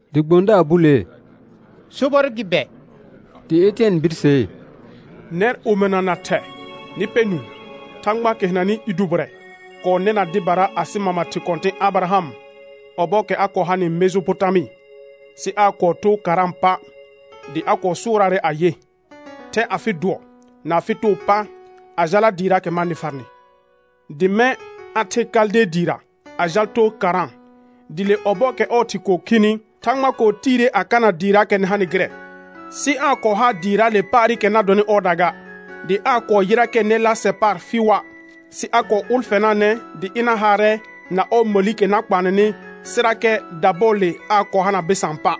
Dɩ gbõdaar bulee: Sobɔr gɩ bɛ? Dɩ Etɩɛn birsee: Nɛr omɩna na thɛ, nɩ pɛ nũu. Thãgbaakɛ hɩnanɩ i dʋbɩrɛ kɔɔ nɛna dɩbara asɩ mama thɩ kɔ̃tɩ̃ Abɩraham ɔbɔɔkɛ a kɔɔ hanɩ Mejopotamɩ, sɩ dɩ aa kɔɔ too Karã pa', dɩ a kɔɔ sʋʋraarɛ ayɩ: «Thɛ afɩ dʋɔ na afɩ too pa a jala dɩɩraakɛ ma nɩ farnɩ.» Dɩ mɛ̃ a the Kalde dɩɩra a jal too Karã. Dɩ le ɔbɔɔkɛ ɔɔ thɩ kɔɔ khini, Thãgba kɔɔ tiire a kana dɩɩraakɛ nɩ hanɩ gɩrɛ; sɩ aa kɔɔ haa dɩɩraale paarɩkɛ na dɔnɩ ɔɔda ga, dɩ aa kɔɔ yɩrakɛ nɛ laasɛ paar fɩɩʋa', sɩ a kɔɔ ʋlfɛnaanɛ dɩ ɩna haarɛ na ɔɔ məlikɛ na kpaanɛnɩ, sɩrakɛ dabɔɔle aa kɔɔ hana bɩsaan pa'.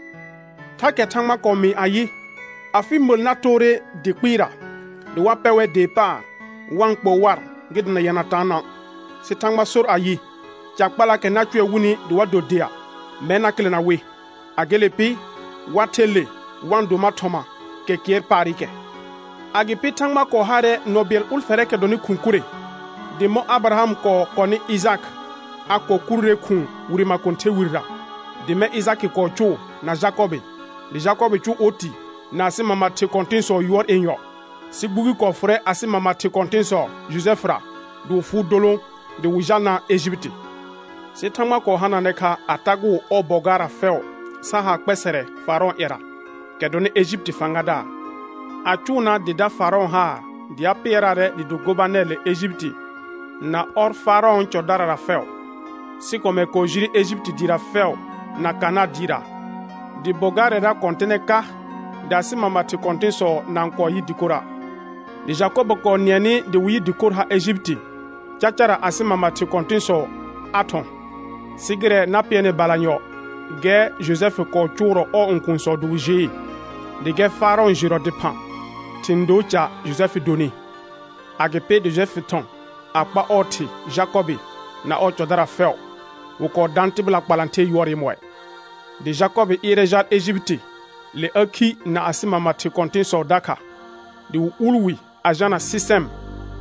Thakɛ Thãgba kɔɔ mɩɩ ayɩ: «Afɩ məl na toore dɩ kpɩɩra dɩ wa pɛ wɛr dee paar wa-n kpoo war gɩ dana yɛna taanã.» Sɩ Thãgba sor ayɩ: «Ca kpalaakɛ na cʋɛ wɩnɩ dɩ wa do dea, mɛr na kɩlɛna wɩ; a gele pɩ, wa ther le wa-n do mar thɔma kɛ kɩɛr paarɩkɛ.» Agɩpɩ Thãgba kɔɔ haarɛ nɔ bɩɛl ʋlfɛrɛɛkɛ dɔnɩ khʋ̃ kurre, dɩ mɔ̃ Abɩraham kɔɔ kɔnɩ Ɩjakɩ, a kɔɔ kuruure khʋ̃ʋ wire makõther wirera; dɩ mɛ̃ Ɩjakɩ kɔɔ cʋʋ na Jakɔbɩ, dɩ Jakɔbɩ cʋʋ oti na asɩ mama thɩ kɔ̃tɩ̃sɔ yʋɔr yenyɔ. Sɩ gbugi kɔɔ fʋrɛ asɩ mama thɩ kɔ̃tɩ̃sɔ Jojɛfɩra dɩ wɩ fʋʋ dolõ dɩ wɩ jalnaa Ejipiti. Sɩ Thãgba kɔɔ hanaanɛ kha a tagʋʋ ɔɔ bɔ gaarra fɛʋ sa haa kpɛsɛrɛ Faarɔ̃ɔ ƴɛra, kɛ dɔnɩ Ejipiti fãgadaar, a cʋʋnaa dɩ da Faarɔ̃ haar dɩ a pɩɛraarɛ dɩ do gobanɛr le Ejipiti na ɔr Faarɔ̃ɔ cɔdarara fɛʋ. Sɩ kɔmɛr kɔɔ jire Ejipiti dɩɩra fɛʋ na Kanãa dɩɩra. Dɩ bɔ gaarɛra kɔ̃tɩnɛ ka dɩ asɩ mama thɩ kɔ̃tɩ̃sɔ na-n kɔɔ yɩ dɩkora'. Dɩ Jakɔbɩ kɔɔ nɩɛnɩ dɩ wɩ yɩ dɩkor har Ejipiti; cacara asɩ mama thɩ kɔ̃tɩ̃sɔ a thɔ̃. Sɩ gɩrɛ na pɩɛrnɩ balanyɔ, gɛr Jojɛfɩ kɔɔ cʋʋrɔ ɔɔ õkuunsɔ dɩ wɩ jɩɩ, dɩ gɛr Faarɔ̃ jɩrɔ dɩphã thɩ̃ doo ca Jojɛfɩ donɩ. Agɩpɩ dɩ Jojɛfɩ thɔ̃ a kpa ɔɔ thɩ Jakɔbɩ na ɔɔ cɔdara fɛʋ; wɩ kɔɔ daan tɩbɩla kpalãther yʋɔr yemɔɩ. Dɩ Jakɔbɩ ɩɩrɛ jal Ejipiti; le a khi na asɩ mama thɩ kɔ̃tɩ̃sɔ dakha. Dɩ wɩ uul wi a jalna Sɩsɛm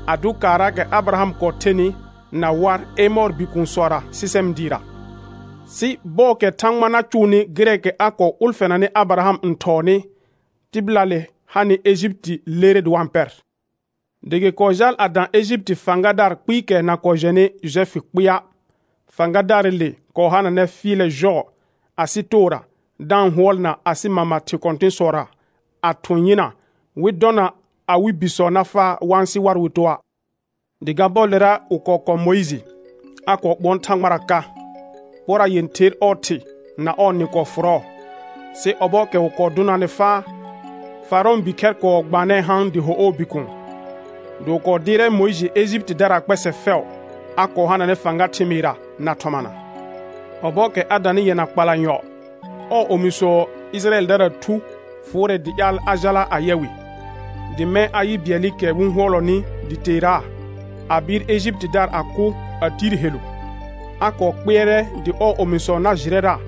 a dʋ kaarraakɛ Abɩraham kɔɔ thenɩ na war Emɔɔr bikuunsɔra Sɩsɛm dɩɩra. Sɩ bɔɔkɛ Thãgba na cʋʋnɩ gɩrɛɛkɛ a kɔɔ ʋlfɛnanɩ Abɩraham n thɔɔnɩ, tɩbɩlaale hanɩ Ejipiti lerre dɩ wa-n pɛr; dɩ gɩ kɔɔ jaal a dã Ejipiti fãgadaar kpɩɩkɛ na kɔɔ jɛnɩ Jojɛfɩ kpɩɩa'. Fãgadaarɩle kɔɔ hananɛ fɩɩlɛ jɔɔ asɩ toora da-n hʋɔlna asɩ mama thɩ kɔ̃tɩ̃sɔra a thʋ̃ yɩna, wɩ dɔna awɩ bisɔ na faa wa-n sɩ war wɩ toa'. Dɩ ga bɔɔlera wɩ kɔɔ kɔ̃ Mʋɩjɩ, a kɔɔ ɓʋɔn Thãgbara ka. Pora yẽther ɔɔ thɩ na ɔɔ nɩ kɔɔ fʋrɔɔ, sɩ ɔbɔɔkɛ wɩ kɔɔ dʋnaanɩ faa, Faarɔ̃ɔ bikhɛr kɔɔ gbaanɛɛ haan dɩ ho ɔɔ bikuun. Dɩ wɩ kɔɔ dɩɩrɛ Mʋɩjɩ Ejipitidaraa kpɛsɛ fɛʋ; a kɔɔ hananɛ fãga thɩmɩɩrra na thɔmana. Ɔbɔɔkɛ a danɩ yɛna kpalanyɔ, ɔɔ omisɔ Ɩjɩrayɛldaraa thu fʋʋrɛ dɩ ƴaal a jala a yɛ wɩ; dɩ mɛ̃ a yɩ bɩɛlɩkɛ wɩ-n hʋɔlɔnɩ dɩ teeraa, a bɩɩr Ejipitidaar a kʋ a tiir helu. A kɔɔ kpɩɛrɛ dɩ ɔɔ omisɔ na jɩrɛra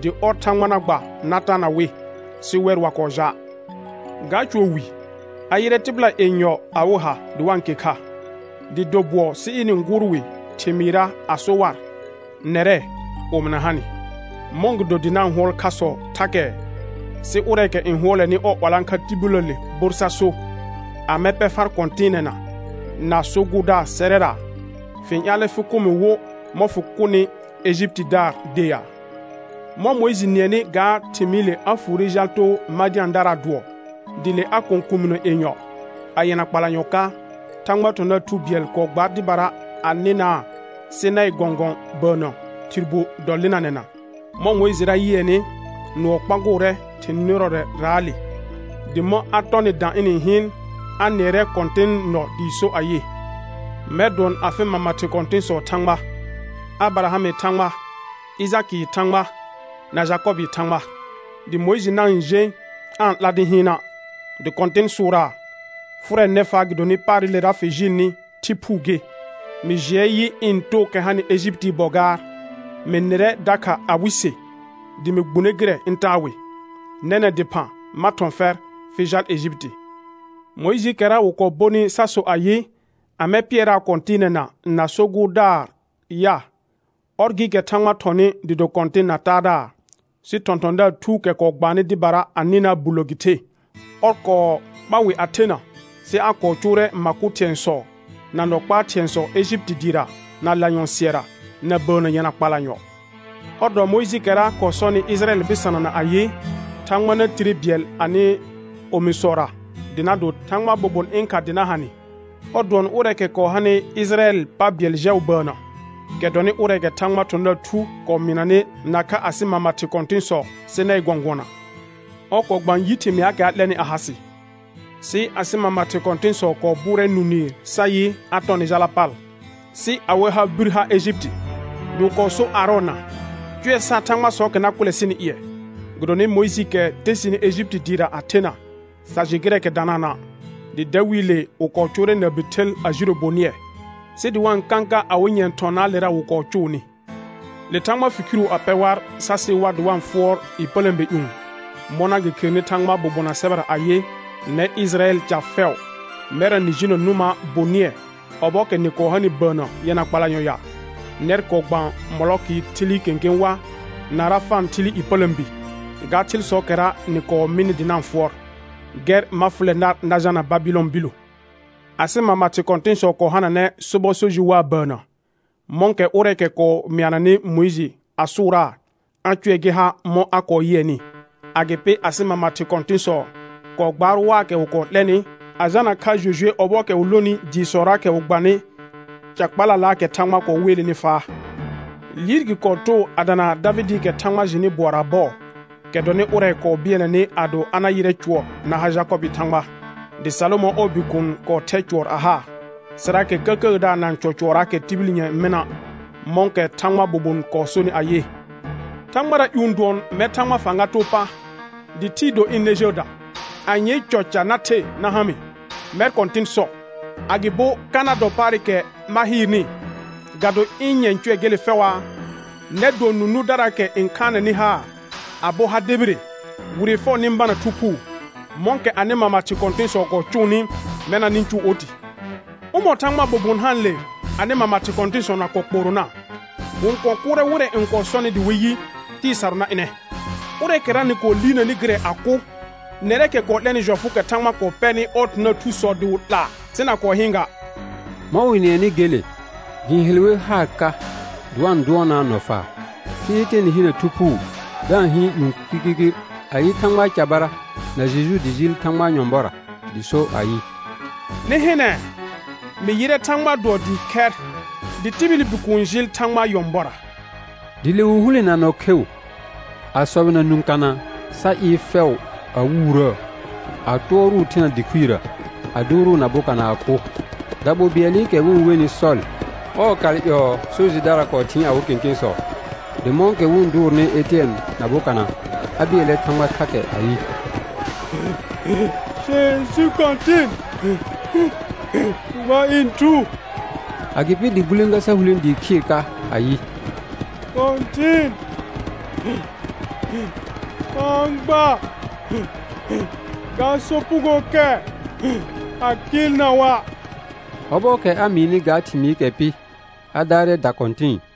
dɩ ɔr Thãgba na gba na taana wɩ, sɩ wɛr wa kɔɔ ja'. Ga cʋɔ wi, a yɩrɛ tɩbɩla yenyɔ awɩ ha dɩ wa-n ke kha, dɩ do bʋɔ sɩ ɩnɩ-n gʋʋr wɩ thɩmɩɩrra a so war: Nɛrɛ, omɩna ha nɩ, mɔ̃gɩdo dɩ na-n hʋɔl khasɔ thakɛ? Sɩ ʋrɛɛkɛ n hʋɔlɛnɩ ɔɔ 'walãkha tibiləəle bor sa so: Amɛ pɛ far kɔ̃tɩɩnɛna na so gʋʋrdaar sɛrɛra? Fɩ-n ƴaalɛ fɩ kʋ mɩ wo mɔ̃ fɩ kʋnɩ Ejipitidaar de ya? Mɔ̃ Mʋɩjɩ nɩɛnɩ ga thɩmɩɩle a fuure jal too Madɩ̃adaraa dʋɔ, dɩ le a kɔ̃ kuuminə yenyɔ. A yɛna kpalanyɔ ka, Thãgbaa thɔ̃thɔ̃daar thu bɩɛl kɔɔ gbaar dɩbara a nɩnaa Sɩnaɩ gɔ̃gɔ̃ bəənnə thɩr bu dɔlɩnanɛna. Mɔ̃ Mʋɩjɩra yɩɛnɩ nʋɔ kpagʋʋrɛ thɩ̃ nɩrɔrɛraale, dɩ mɔ̃ a tɔnɩ dã ɩnɩ-n hɩɩn, a nɩɛrɛ Kɔ̃tɩnɩ nɔ dɩɩ so ayɩ: «Mɛr dʋɔn afɩ mama thɩ kɔ̃tɩ̃sɔɔ Thãgba, Abɩrahamɩ Thãgba, Ɩjakɩɩ Thãgba, na Jakɔbɩɩ Thãgba.» Dɩ Mʋɩjɩ na-n jẽ aa-n 'la dɩ hɩɩna'. Dɩ Kɔ̃tɩn sʋʋraa: «Fʋrɛ nɛfaa gɩdonɩ paarɩlera fɩ jɩɩlnɩ, thɩ phuu gɩ. Mɩ jɩɛ yɩ ɩ̃ tookɛ hanɩ Ejipitii bɔ gaar, mɩ nɩrɛ dakha awɩ se dɩ mɩ gbune gɩrɛ ɩ̃ taa wɩ. Nɛnɛ̃ dɩphã ma thɔ̃ fɛr fɩ jal Ejipiti.» Mʋɩjɩɩkɛra wɩ kɔɔ bonɩ sa so ayɩ, amɛ pɩɛraa kɔ̃tɩɩnɛna na so gʋʋrdaar ya? Ɔr gɩɩkɛ Thãgba thɔnɩ dɩ do kɔ̃tɩn na taadaar, sɩ thɔ̃thɔ̃daar thuukɛ kɔɔ gbaannɩ dɩbara a nɩnaa bullə gɩ the. Ɔr kɔɔ kpa wɩ a thena sɩ a kɔɔ cʋʋrɛ ma kʋ thɩ̃ɛsɔ, na nɔ kpaa thɩ̃ɛsɔ Ejipiti dɩɩra na lanyɔ̃ sɩɛra, na bəənnə yɛna kpalanyɔ. Ɔr dɔ Mʋɩjɩɩkɛra kɔɔ sɔnɩ Ɩjɩrayɛl bɩsanana ayɩ: «Thãgba na tire bɩɛl anɩ omisɔra dɩ na do Thãgbaa bobon ɩ̃ kha dɩ na ha nɩ.» Ɔr dʋɔn ʋrɛɛkɛ kɔɔ hanɩ Ɩjɩrayɛlɩ pa bɩɛl jɛʋ bəənnə, kɛ dɔnɩ ʋrɛɛkɛ Thãgbaa thɔ̃thɔ̃daar thu kɔɔ mɩɩnanɩ nakha asɩ mama thɩ kɔ̃tɩ̃sɔ Sɩnaɩ gɔ̃gʋɔna, ɔr kɔɔ gbaan yi thɩmɩaakɛ a 'lɛnɩ a ha sɩ. Sɩ asɩ mama thɩ kɔ̃tɩ̃sɔ kɔɔ bʋʋrɛ nũ nɩɩr sa yɩ a tɔ nɩ jala pal, sɩ awɩ ha bir ha Ejipiti dɩ wɩ kɔɔ sor Aarɔna: «Cʋɛ sar thãgbasɔɔkɛ na kʋlɛ sɩnɩ ƴɩɛ, gɩdonɩ Mʋɩjɩɩkɛ te sɩnɩ Ejipiti dɩɩra a thena sa jɩ gɩrɛɛkɛ danaana'.» Dɩ dawiile wɩ kɔɔ cʋʋrɛ na bi thɩl a jiro bonɩɛ, sɩ dɩ wa-n kãka awɩ nyɛ̃ thɔnaalera wɩ kɔɔ cʋʋnɩ. Le Thãgba fi khiru a pɛ war sa sɩ war dɩ wa-n fʋɔr ƴepələ̃be ƴũ, mɔna gɩ kherenɩ Thãgbaa bobonaa sɛbɛra ayɩ: «Nɛr Ɩjɩrayɛl ca fɛʋ, mɛrra nɩ jinə nʋma bonɩɛ ɔbɔɔkɛ nɩ kɔɔ hanɩ bəənnə yɛna kpalanyɔ ya? Nɛr kɔɔ gbaan Mɔlɔkɩ thɩlɩ kẽkẽ wa, na Rãfã thɩlɩ ƴepələ̃bi, ga thɩlsɔɔkɛra nɩ kɔɔ mɩnɩ dɩ na-n fʋɔr. Gɛr ma fʋlɛ nar na jalna Babɩlɔn billo.» Asɩ mama thɩ kɔ̃tɩ̃sɔ kɔɔ hananɛ sobɔ so jɩ waa bəənnə, mɔ̃kɛ ʋrɛɛkɛ kɔɔ mɩananɩ Mʋɩjɩ a sʋʋraa, a cʋɛ gɩ ha mɔ̃ a kɔɔ yɩɛnɩ. Agɩpɩ asɩ mama thɩ kɔ̃tɩ̃sɔ kɔɔ gbaar waakɛ wɩ kɔɔ 'lɛnɩ, a jalna kha Jojue ɔbɔɔkɛ wɩ lonɩ dɩɩsɔraakɛ wɩ gbanɩ ca kpalalaakɛ Thãgba kɔɔ weelenɩ faa. Liir gɩ kɔɔ too a dana Davɩdɩɩkɛ Thãgba jɩnɩ bʋɔraa bɔɔ, kɛ dɔnɩ ʋrɛ kɔɔ bɩɛlnɛnɩ ado a na yɩrɛ cʋɔr na ha Jakɔbɩɩ Thãgba. Dɩ Salomɔ̃ ɔɔ bikuun kɔɔ thɛ cʋɔr a haa, sɩrakɛ Kəkəədaar na-n cɔ cʋɔrraakɛ tibil nyɛ̃ɛ mɩna', mɔ̃kɛ Thãgbaa bobon kɔɔ sonɩ ayɩ: «Thãgbara ƴũ dʋɔn, mɛr Thãgbaa fãga too pa, dɩ thɩɩ do ɩ̃ nɛ jəəda. Anyee cɔ ca na the na ha mɩ, mɛr Kɔ̃tɩn sɔ, agɩbo ka na dɔ paarɩkɛ ma hɩɩrnɩ? Ga do ɩ̃ nyɛ̃ cʋɛ gele fɛʋaa?» Nɛr dʋɔn nũ nʋʋrdaraakɛ n khaanɛnɩ haar a bo ha debire, wire fɛʋ nɩ-n bana Thu Phuu. Mɔ̃kɛ anɩ mama thɩ kɔ̃tɩ̃sɔ kɔɔ cʋʋnɩ, mɛna nɩ-n cʋʋ oti. Ʋmɔ̃ Thãgbaa bobon haanle anɩ mama thɩ kɔ̃tɩ̃sɔ na kɔɔ kpoorona? Wɩ-n kɔɔ kʋʋrɛ wɩrɛ n kɔɔ sɔnɩ dɩ wɩ yɩ, Tɩɩ sarʋ na ɩnɛ, ʋrɛɛkɛra nɩ kɔɔ liirnanɩ gɩrɛ a kʋ, nɛrɛɛkɛ kɔɔ 'lɛnɩ jɔfʋʋkɛ Thãgba kɔɔ pɛrnɩ ɔɔ thɔ̃thɔ̃daar thusɔ dɩ wɩ 'laa, sɩ na kɔɔ hɩɩn ga. Mɔ̃ wɩ-n nɩɛnɩ gele, gɩ-n hel wer haar ka dɩ wa-n dʋɔnaa nɔfaar. Sɩ Etɩɛn hinə Thu Phuu da-n hɩɩn ƴũ kirkirkir, a yɩ Thãgbaa carbara na Jeju dɩ jɩɩl Thãgbaa nyɔ̃bɔra, dɩ so ayɩ: Nɩ hɩnɛ, mɩ yɩrɛ Thãgbaa dʋɔ dɩɩ khɛr, dɩ tibili Bikuun jɩɩl Thãgbaa nyɔ̃bɔra. Dɩ le wɩ hulẽ na nɔ kheu, a sɔbɩna nũ kana sa ɩɩr fɛʋ a wuurəə, a tʋɔrʋʋ thena dɩ khuirə, a dʋʋrʋʋ na bokana a kʋ. Daɓol bɩɛlɩkɛ wɩ-n wenɩ Sɔl, ɔɔ kal ƴɔɔ so jɩdara kɔɔ thɩɩn awɩ kẽkẽsɔ. Dɩ mɔ̃kɛ wɩ-n dʋʋrnɩ Etɩɛn na bokana, a bɩɛlɛ Thãgba thakɛ ayɩ: Jeju Kɔ̃tɩn, gba ɩ̃ thu. Agɩpɩ dɩ gulẽga sa hulẽ dɩɩ khɩɩr ka ayɩ: Kɔ̃tɩn, fa-n gba ga sopugookɛ a kɩɩlna wa'. Ɔbɔɔkɛ a mɩɩnɩ ga thɩmɩɩkɛ pɩ, a daarɛ da kɔ̃tɩ̃ɩ.